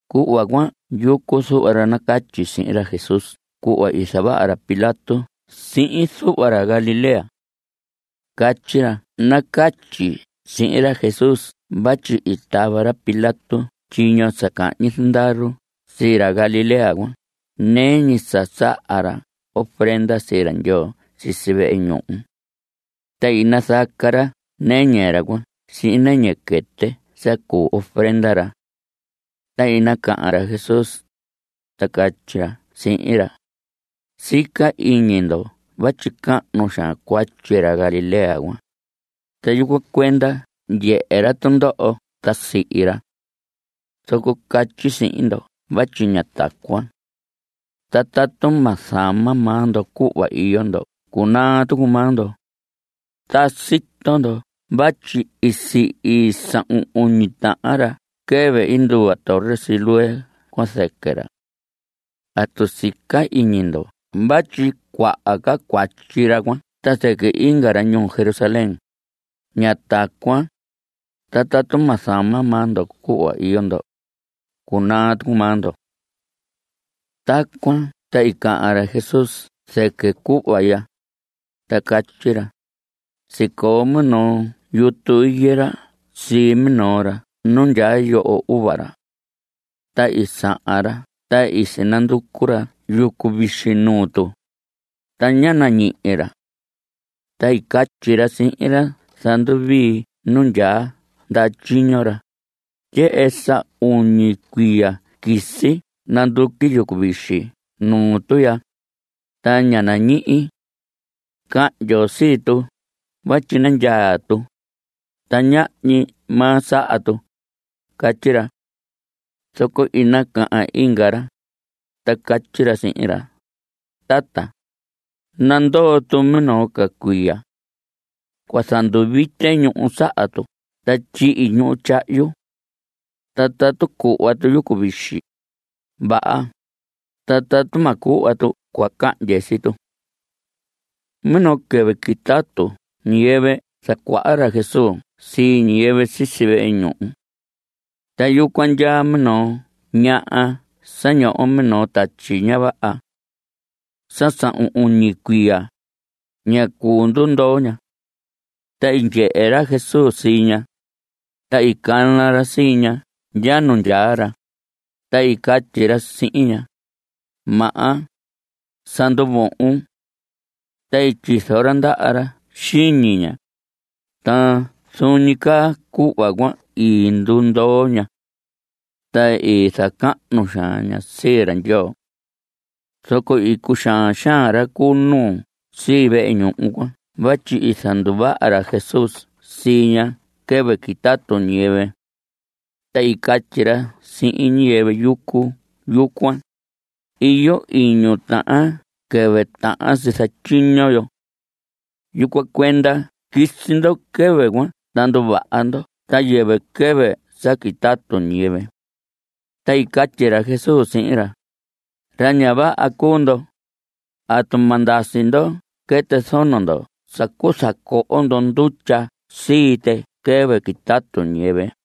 Cuhva cuan yucu zuhva ra nacatyi sihin ra Jesús cuhva i zavaha ra Pilato sihin zuhva ra Galilea. Catyi ra nacatyi sihin ra Jesús vatyi i tava ra Pilato tyiño sa cahñi zandaru sii ra Galilea cuan nɨɨ ñi sa saha ra ofrenda sii ra Ndyoo sisi vehe ñuhu. Ta i nazaca ra nɨñɨ ra cuan sihin nɨñɨ quɨtɨ sa cuu ofrenda ra. Ta i nacahan ra Jesús, ta catyi ra sihin ra: Sica iñi ndo vatyi cahnu xaan cuatyi ra Galilea cuan. Ta yucuan cuenda ndyehe ra tundoho ta sihi ra. Zoco catyi sihin ndo vatyi ña tacuan. Ta tatu ma zama maa ndo cuhva iyo ndo cunaa tucu maa ndo. Ta sito ndo vatyi i sihi sahun uñi tahan ra quɨvɨ i nduva torre Siloé cuan zɨquɨ ra. ¿Atu sica iñi ndo vatyi cuaha ca cuatyi ra cuan ta zɨquɨ inga ra ñuu Jerusalén? Ña tacuan. Ta tatu ma zama maa ndo cuhva iyo ndo, cunaa tucu maa ndo. Tacuan ta i cahan ra Jesús zɨquɨ cuhva ya, ta catyi ra: Sicoo minoo yutu higuera sii minoo ra nu ndyaa yoho uva ra. Ta i sahan ra ta i sinanducu ra yucu vixi nuu tu, ta ñá nañihi ra. Ta i catyi ra sihin ra zanduvii nu ndyaa ndaha tyiño ra: “Ndyehe, sa uñi cuiya quisi nanduqui yucu vixi nuu tu ya, ta ña nañihi. Cahndyon sii tu vatyi nandyaa ñi tu, ta ñahñi maa saha tu.” Catyi ra. Zoco i nacahan inga ra, ta catyi ra sihin ra: “Tata, nandoo tu minoo ca cuiya. Cua zanduvite ñuhu saha tu ta tyihi ñuhu tyahyu. Ta tatu cuhva tu yucu vixi, vaha, ta tatu ma cuhva tu cua cahndye sii tu.” Minoo quɨvɨ quitatu ñiyɨvɨ zacuaha ra Jesús sii ñiyɨvɨ sisi vehe ñuhu. Ta yucuan ndyaa minoo ñaha sa ñoho minoo tatyi ña vaha. Sa sahun uñi cuiya, ña cuu ndundoo ña. Ta i ndyehe ra Jesús sii ña. Ta i cana ra sii ña ndya nu ndyaa ra, ta i catyi ra sihin ña: Maha, sa nduvohon. Ta i tyizo ra ndaha ra xiñi ña, ta zuun ñi caa cuhva cuan i ndundoo ña. Ta i zacahnu xaan ña sii ra Ndyoo. Zoco i cuxaan xaan ra cu nuu sii vehe ñuhu cuan vatyi i zanduvaha ra Jesús sii ña quɨvɨ quitatu ñiyɨvɨ. Ta i catyi ra sihin ñiyɨvɨ yucu yucuan: Iyo iñu tahan quɨvɨ tahan si zatyiño yo. Yucuan cuenda quisi ndo quɨvɨ cuan ta nduvaha ndo ta yɨvɨ quɨvɨ sa quitatu ñiyɨvɨ. Ta i catyi ra Jesús sihin ra: Ra ña vaha cuu ndo. ¿Atu ma ndasi ndo quɨtɨ zono ndo sa cuu zacoho ndo ndutya sii tɨ quɨvɨ quitatu ñiyɨvɨ?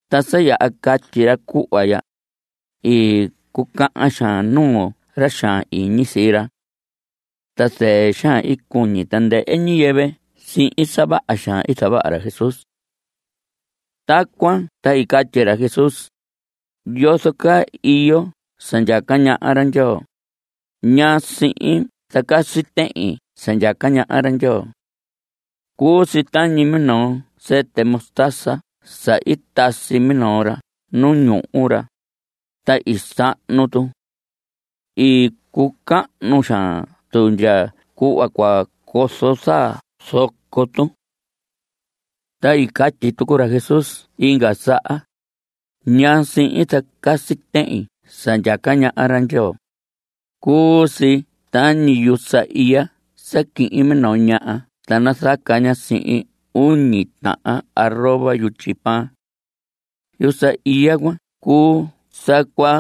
Ta sa yaha catyi ra cuhva ya, i cucahan xaan nuu ra xaan iñi sii ra. Ta zɨɨ xaan i cuñi tandɨhɨ ñiyɨvɨ sihin sa vaha xaan sa zavaha ra Jesús. Tacuan ta i catyi ra Jesús: ¿Yozo caa iyo sa ndyaca ñaha ra Ndyoo? ¿Ñaa sihin zacasi tehin sa ndyaca ñaha ra Ndyoo? Cuu si tañi minoo sɨtɨ mostaza sa i tasi minoo ra nu ñuhu ra, ta i sahnu tu. I cucahnu xaan tu ndya cuhva cua cozo zaa zoco tu. Ta i catyi tucu ra Jesús inga saha: ¿Ñaa sihin zacasi tehin sa ndyaca ñaha ra Ndyoo? Cuu si tañi yusa iya sa quihin minoo ñaha ta nazaca ña sihin uñi tahan arroba yutyi pan. Yusa iya cuan cuu sa cua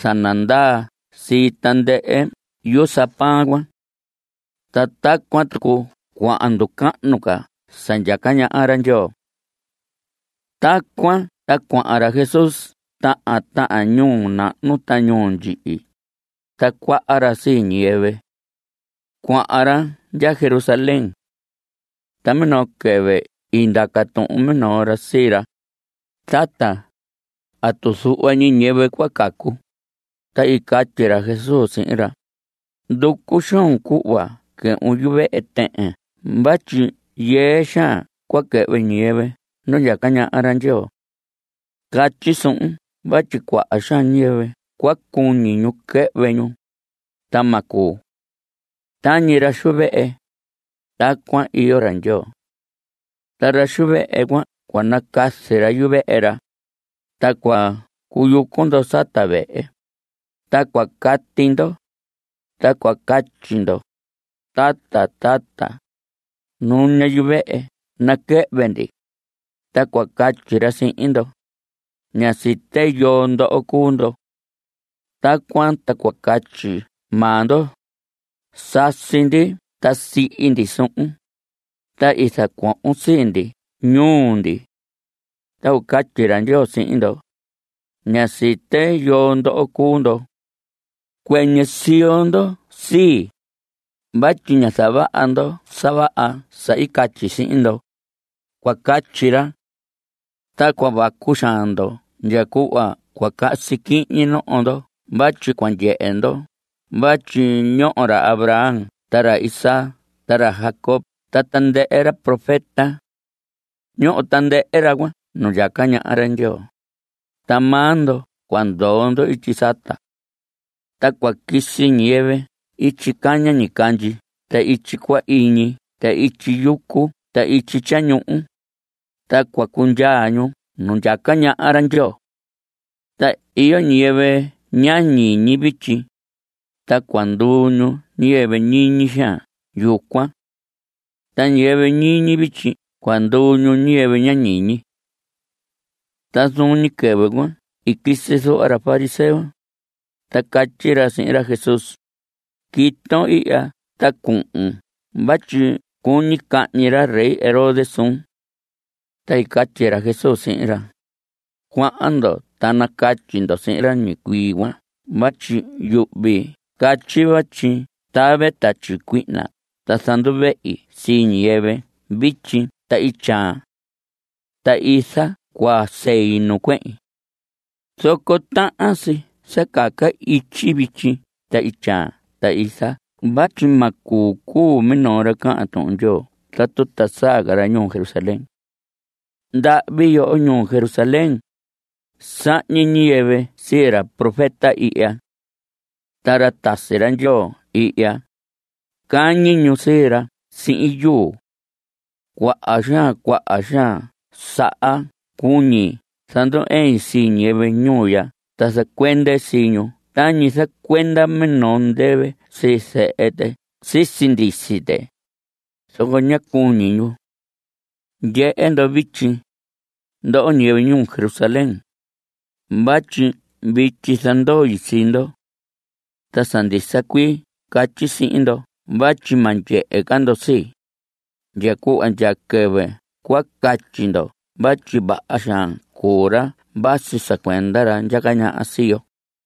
zanandaa sii tandɨhɨ yusa pan cuan. (Ta tacuan tucu cuahan nducahnu ca sa ndyaca ñaha ra Ndyoo.) Tacuan ta cuahan ra Jesús tahan tahan ñuu nahnu ta ñuu ndyihi, zacuaha ra sii ñiyɨvɨ. Cuahan ra ndya Jerusalén. Ta minoo quɨvɨ i ndaca tuhun minoo ra sii ra: Tata, ¿atu zuhva ñi ñiyɨvɨ cua cacu? Ta i catyi ra Jesús sihin ra: Nducu xoon cuhva quɨhvun yuvehe tɨhɨn vatyi yɨɨ xaan cua quɨhvɨ ñiyɨvɨ nu ndyaca ñaha ra Ndyoo. Catyi suhun vatyi cuaha xaan ñiyɨvɨ cua cuñi ñu quɨhvɨ ñu, ta ma cuu. Tañi ra xu vehe, tacuan iyo ra Ndyoo. Ta ra xu vehe cuan cua nacazi ra yuvehe ra. Ta cua cuyucu ndo sata vehe, ta cua cati ndo, ta cua catyi ndo: “Tata, tata, nuña yuvehe naquɨhvɨ ndi.” Ta cua catyi ra sihin ndo: “Ña site yoo ndoho cuu ndo.” Tacuan ta cua catyi maa ndo: “Sasi ndi ta sihi ndi suhun, ta i zacuohon sii ndi ñuu ndi.” Ta cua catyi ra Ndyoo sihin ndo: “Ña site yoo ndoho cuu ndo. Cuɨñɨ siyo ndo sii, vatyi ñá zavaha ndo sa vaha sa i catyi sihin ndo.” Cua catyi ra. Ta cua vacu xaan ndo ndya cuhva cua casi quihñi noho ndo vatyi cua ndyehe ndo vatyi ñoho ra Abraham ta ra Isaac ta ra Jacob ta tandɨhɨ ra profeta. Ñoho tandɨhɨ ra cuan nu ndyaca ñaha ra Ndyoo, ta maa ndo cua ndoo ndo ityi sata. Ta cua quisi ñiyɨvɨ ityi caña ñicandyi ta ityi cuahiñi ta ityi yucu ta ityi tyañuhu, ta cua cundyaa ñu nu ndyaca ñaha ra Ndyoo. Ta iyo ñiyɨvɨ ña ñiñi vityi, ta cua nduu ñu ñiyɨvɨ ñiñi xaan yucuan. Ta ñiyɨvɨ ñiñi vityi cua nduu ñu ñiyɨvɨ ña ñiñi. Ta zuun ñi quɨvɨ cuan i quisi zuhva ra fariseo, ta i catyi ra sihin ra Jesús: Quiton ihya ta cuhun vatyi cuñi cahñi ra rey Herodes suun. Ta i catyi ra Jesús sihin ra: Cuahan ndo ta nacatyi ndo sihin ra ñicuii cuan vatyi yuhvi catyi vatyi tave tatyi cuihna ta zanduvehi sii ñiyɨvɨ vityi ta ityaan. Ta iza cua sei nu cuehin. Zoco tahan si sa caca ityi vityi ta ityaan ta iza vatyi ma cuu cuu minoo ra cahan Tuhun Ndyoo tatu ta saa ca ra ñuu Jerusalén. ¡Ndahvi yoho ñuu Jerusalén! Sahñi ñiyɨvɨ sii ra profeta ihya. Ta ra tasi ra Ndyoo ihya, cañi ñu sii ra sihin yuu. ¡Cuaha xaan cuaha xaan saha cuñi zandu‑ɨin sii ñiyɨvɨ ñuu ya ta zacuende sii ñu tañi zacuenda minoo ndɨvɨ sii zehe tɨ sisi ndisi tɨ, zoco ña cuñi ñu! Ndyehe ndo vityi, ndoho ñiyɨvɨ ñuu Jerusalén, vatyi vityi zandoi sii ndo. Ta sa ndisa cuii catyi sihin ndo vatyi ma ndyehe ca ndo sii, ndya cuhva ndya quɨvɨ cua catyi ndo vatyi vaha xaan cuu ra vasi sa cuenda ra ndyaca ñaha sii yo.